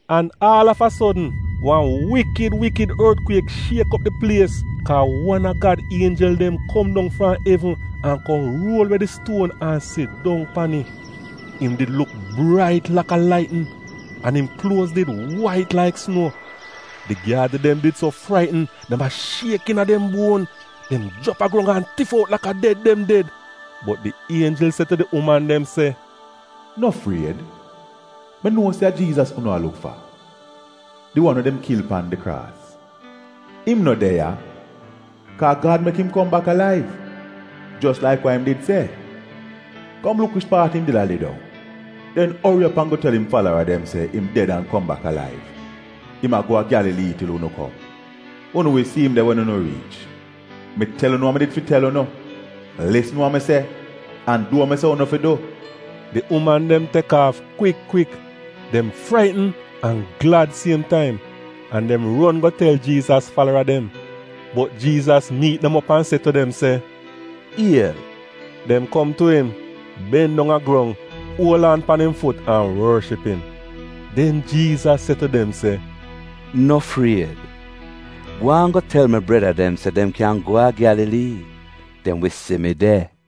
An aal av a sodn wan wikid wikid ortkwiek shiek op di plies kaa wan a Gad ienjel dem kom dong fram evn an kom ruol we di stuon an sidong pan it. Im did luk brait laka laitnin an im kluoz did wait laik sunuo. Di gyaadi dem did so fraitn dem a shiek iina dem buon. Dem jrap a grong an tif out laka ded dem ded. Bot di ienjel se tu di uman dem se, “No fried; mi nuo se a Jiizas unu a luk fa, di wan we dem kil pan di kraas. Im no de ya, kaa Gad mek im kom bak alaiv, jos laik wa im did se. Kom luk wich paat im did a lidong. Den ori op an go tel im falara dem se, ‘Im ded an kom bak alaiv. Im a go a Gyalalii til unu kom. Unu wi si im de wen unu riich.’ Mi tel unu we mi did fi tel unu!’ Lisn wa mi se an du wa mi se unu fi du.” Di uman dem tek aaf kwik kwik! Dem fraitn an glad siem taim, an dem ron go tel Jiizas falara dem. Bot Jiizas miit dem op an se tu dem se, “Iel!” Dem kom tu im, ben dong a grong, uol aan pan im fut an worship im. Den Jiizas se tu dem se, “No fried. Gwaan go tel mi breda dem se dem kyan go a Gyalalii. Dem wi si mi de.”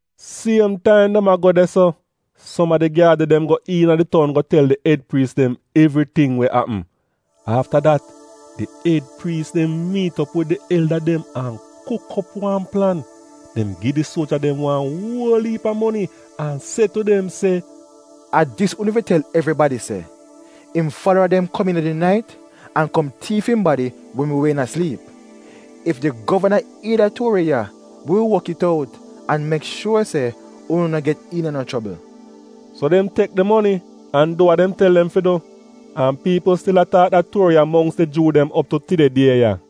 Siem taim dem a go de-so, som a di gyaadi dem go iina di toun go tel di ed priis dem evriting we apm. Afta dat, di ed priis dem miit op wid di elda dem an kuk op wan plan. Dem gi di suoja dem wan uol iip a moni an se tu dem se, “A dis unu fi tel evribadi se, ‘Im falara dem kom iina di nait an kom tiif im badi wen wi wehn a sliip.’ Ef di govana ier da tuori ya, wi wi wok it out an mek shuor se unu no get iina no chobl.” So dem tek di moni an du wa dem tel dem fi du. An piipl stil a taak da tuori ya mongks di Juu dem op tu tide die ya.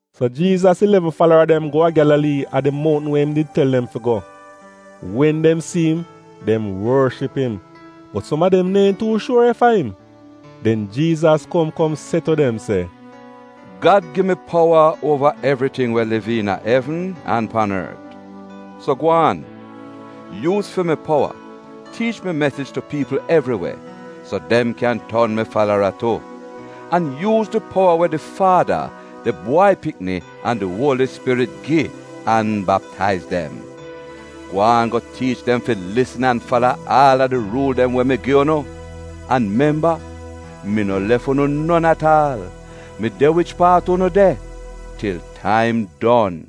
So Jiizas ilevn falara dem go a Gyalalii a di mountn we im did tel dem fi go. Wen dem si im, dem worship im, bot som a dem neehn tuu shuor ef a im. Den Jiizas kom kom se tu dem se, “Gad gi mi powa uova evriting we a liv iina evn an pan ort. So gwaan, yuuz fi mi powa, tiich mi mesij tu piipl evri we, so dem kyan ton mi falara tu. An yuuz di powa we di Faada, di Bwai Pikni an di Uoli Spirit gi an baptaiz dem. Gwaan go tiich dem fi lisn an fala aal a di ruul dem we mi gu'unu. An memba, mi no lef unu non at aal, mi de wich paat unu de til taim don.”